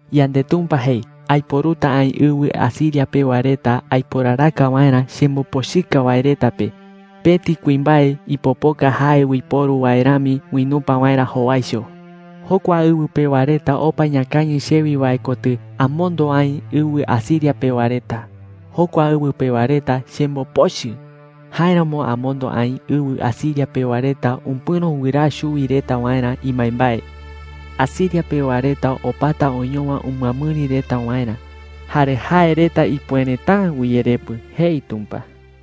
5YandeTumpa jei: “Aiporuta aï ɨwɨ Asiria pewa reta aiporaraka waerä chembopochɨka wae reta pe, pëti kuimbae ipopoka jae uiporu wae rami uinupa waerä jowaicho. 6Jokua ɨwɨ pewa reta opa iñakañɨ chewi wae kotɨ amondo aï ɨwɨ Asiria pewa reta. Jokua ɨwɨ pewa reta chembopochɨ; jáeramo amondo aï ɨwɨ Asiria pewa reta upɨ̈ro wɨraa chuwi reta waerä imbaembae. Asiria pewa reta opata oñowa umɨamɨri reta waerä, jare jae reta ipuereta’ä uyerepɨ,” jei Tumpa.